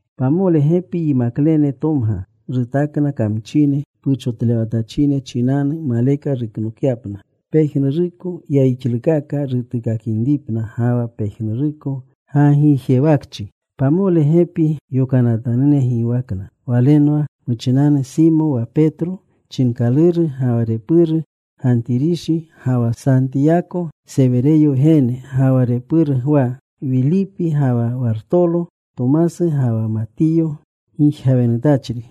Pamole gepi yimaklene tomga. Rutakna kamchine puchotlewatachine chinanu maleka ruknokyapna, pejnuruko yayixlukaka rutuukakinripna ga wa pejnuruko gagijewakchi Pamole gepi yokanatanune giwakna walenwa: muchinanu Simo wa Petro chinkaluru, ga wa repuru, Gantirishi, ga wa Santiyako, Sewereyo wgene ga wa repuru Gwa; Wilipi ga wa Wartolo, Tomasu ga wa Matiyo gijgawenutachri,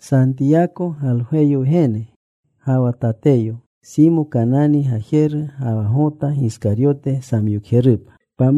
Santiyako, Galgweyo wgene, ga wa Tateyo. Simo Kanani gajeru ga wa Gota Giskaryote samyokjerupa.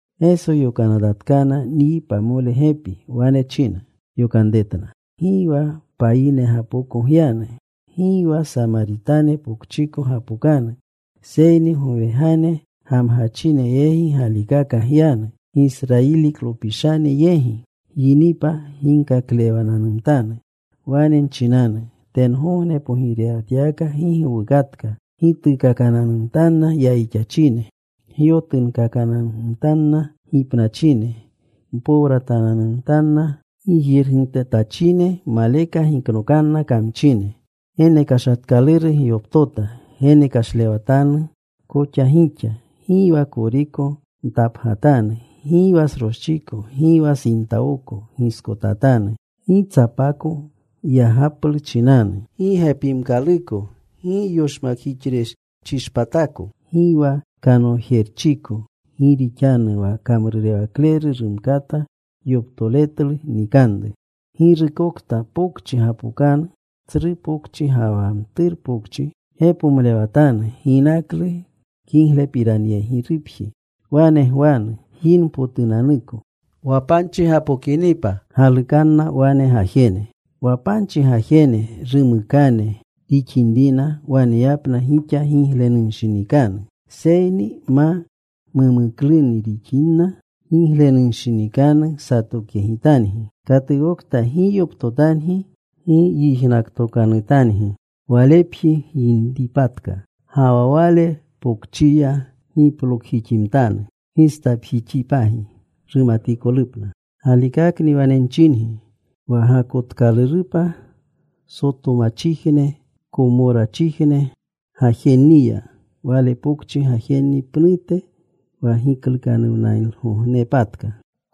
Geso yokanatatkana nyi pamole gepi. Wane china yokanretna, “Gi wa payingapoko gyanu. Gi wa Samaritane pokchiko gapokanu. Seyni gowegane gamgachine yegi galikaka gyanu, Gisrayiliklopishane yegi. Gyinipa ginkaklewananumtanu. Wane nchinanu, ‘Tengogne pogirewatyawaka gi gowukatka.’ Gituukakananumtanna yayixachine. Gyotunkakananumtanna gipnachine. Mpowratananumtanna gijirgitutachine. Maleka giknokanna kamchine. Genekashatkaluru gyoptota. Genekashlewatanu koxa gixa. Gi wa koriko ntapgatanu, gi wa sroschiko; gi wa sintawoko giskotatanu. Gi tsapako yagaplu chinanu, gi gepimkaluko, gi yoshmakjixrechishpatako, gi wa kanojerchiko. Gi rixanu wa kamrurewakleru rumkata yoptoletlu nikanru. “Girukokta pokchi gapokanu tsru pokchi ga wa mturu pokchi, gepomlewatanu ginaklu kiglepiranyegirupji. Wane gwanu gyinpotunanuko. Wa panchi gapokinipa galukanna wane gajene. Wa panchi gajene rumukane rixinrina, waneyapna gixa giglenunshinikanu. Seyni ma mumuklunu rixinrina giglenunshinikanu satokyegitangi. Katukokta gi yoptotangi, gi yijnaktokanutangi, walepji gyinpatka ga wa wale pokchiya, giplokjiximtanu gistapjixipagi, rumatikolupna. Galikakni wane nchingi wa gakotkalurupa Sotomachijne, Komorachijne gajenniya wale pokchi gajenni pnute wa giklukanuwnalgognepatka.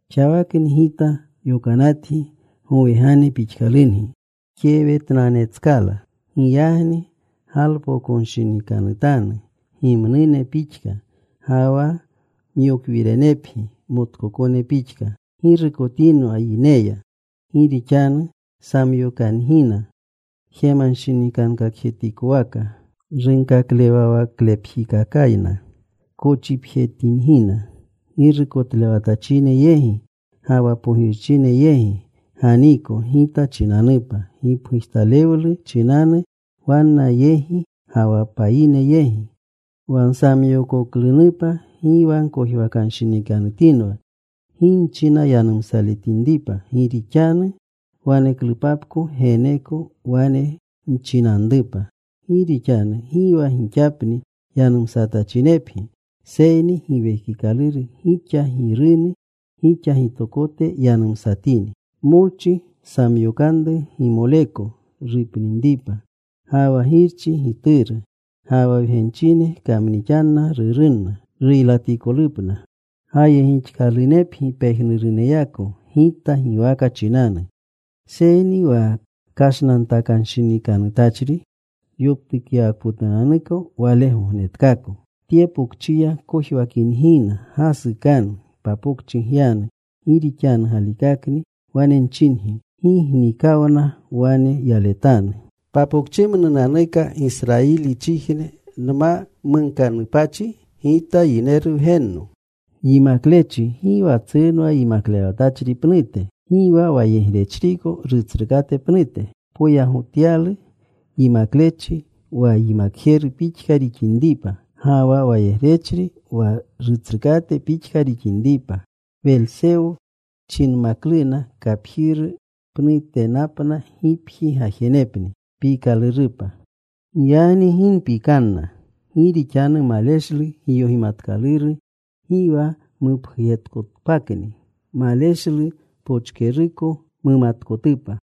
“Xawakni Gita yokanatgi gowegane pixkalungi kewetnanetskala. Giyagni galpokonshinikanutanu gimnune pixka, ga wa myokwirenepgi motkokone pixka. “Ggirukotinwa yineya. Gi rixanu samyokangina jemanshinikankakjetikowaka. Runkaklewawaklepjikakayna kochipjetingina. Girukotlewatachine yegi ga wa pogirchine yegi ganiiko Gita chinanupa, gipgujtalewlu chinanu wanna yegi ga wa payine yegi. Wa nsamyookoklunupa gi wa gkojwakanshinikanutinwa gi nchina yanumsaletinripa. Gi rixanu waneklupapko geneeko wane nchinanrupa. Gi rixanu gi wa gixapni yanumsatachinepgi, seyni Giwekikaluru gixa Girunu gixa gitokote yanumsatini. “Molchi samyokanru gimoleko rupninripa, ga wa girchi gituru. Ga wa wgenchine kamnixanna rurunna ruylatikolupna. Gayegixkalunepgi pejnuruneyako Gita giwaka chinanu, seyni wa kashnantakanshinikanutachri yoptukyawakpotunanuko wale gognetkaako. Tye pokchiya kojwakingina gasukanu. Papokchi gyanu. Gi rixanu galikakni wane nchingi, gi gnikawna wane yaletanu papokchimnunanuka Gisrayilichijne nma munkanupachi Gita Yineru Wgenno. “Yimaklechi gi wa tsrunwa yimaklewatachri pnute. Gi wa wayegrechriko, rutsrukate pnute. Poyagotyalu yimaklechi wa yimakjeru pixka rixinripa, ga wa wayegrechri wa rutsrukate pixka rixinripa. Welsewo chinmakluna kapjiru pnutenapna gipji gajenepni. “Giyagni gi mpikanna. Gi rixanu maleshlu giyogimatkaluru gi wa mupgujetkotpakni. Maleshlu pochkeruko mumatkotupa.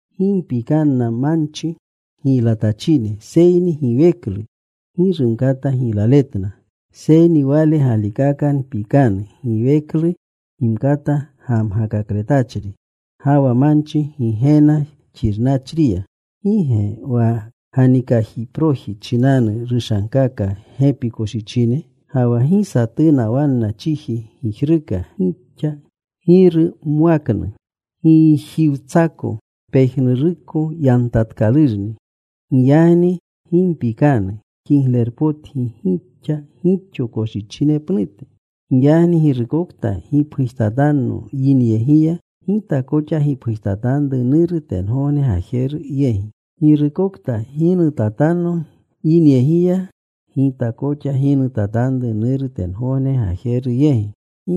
Gi mpikanna manchi giylatachine seyni giweklu gi rumkata giylaletna. Seyni Wale galikaka mpikanu giweklu gimkata gamgakakletachri ga wa manchi Gigena xirnachriya. ¿Gi ge wa ganikajiproji chinanu rushankaka gepi koshichine? Ga wa gi satuna wanna chiji gijruka gixa Giru mwaknu. Gijiwtsako pejnuruko yantatkalurni. Giyagni gi mpikanu. Kiglepotgi gixa gixo koshichine pnute. “Giyagni girukokta gipgujtatanno yineyegiya, Gita koxa gipgujtatanru Nuru tengogne Gajeru yegi. Girukokta ginutatanno yinyegiya, Gita koxa ginutatanru Nuru tengogne Gajeru yegi.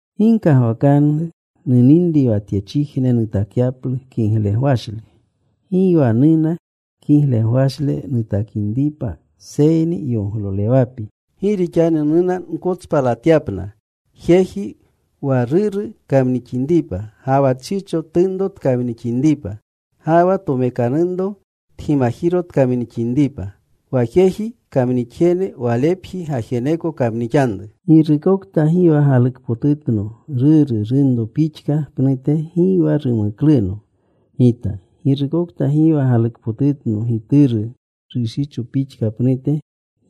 “Gi gkagwakanru nuninri wa tyechijne nutakyaplu kiglegwashle. Gi wa nuna kiglewashle nutakinripa seyni yoglolewapi. Gi rixanu nuna nkotspalatyapna: Jeji wa ruru kamnixinripa, Ga wa tshicho tunro tkamnixinripa, Ga wa tomekanunro tgimajiro tkamnixinripa. Wa jeji kamnixjene, walepji gajeneko kamnixanru. “Girukta gi wa galukpotutno ruru, runro pixka pnute, gi wa rumukluno Gita. Girukta gi wa galukpotutno gituru, rushicho pixka pnute,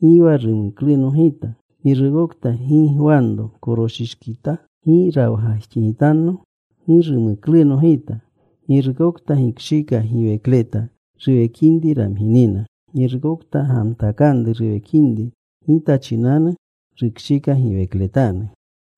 gi wa rumukluno Gita. Girukta gi gwanro koroshiteshkita, gi rawgajxigitanno, gi rumukluno Gita. Girukta gikshika giwekleta, ruwekinri ramginina. Girukta gamtakanru ruwekinri Gita chinanu, rukshika giwekletanu.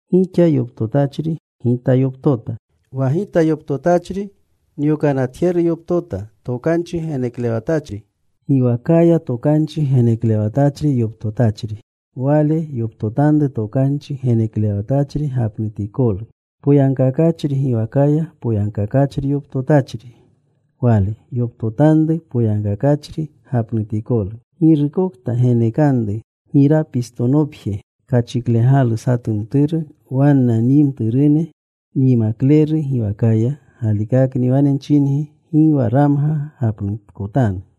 “Gixa yoptotachri, Gita yoptota. Wa Gita yoptotachri nyokanatjeru yoptota. Tokanchi geneklewatachri giwakaya tokanchi geneklewatachri yoptotachri, wale yoptotanru tokanchi geneklewatachri gapnutikolu. Poyagkakachri giwakaya poyagkakachri yoptotachri, wale yoptotanru poyagkakachri gapnutikolu. Girukokta genekanru girapistonopje kachiklegalu satu mturu wanna nyi mturune nyimakleru giwakaya, galikakni wane nchingi, gi wa ramga gapnutkotanu.”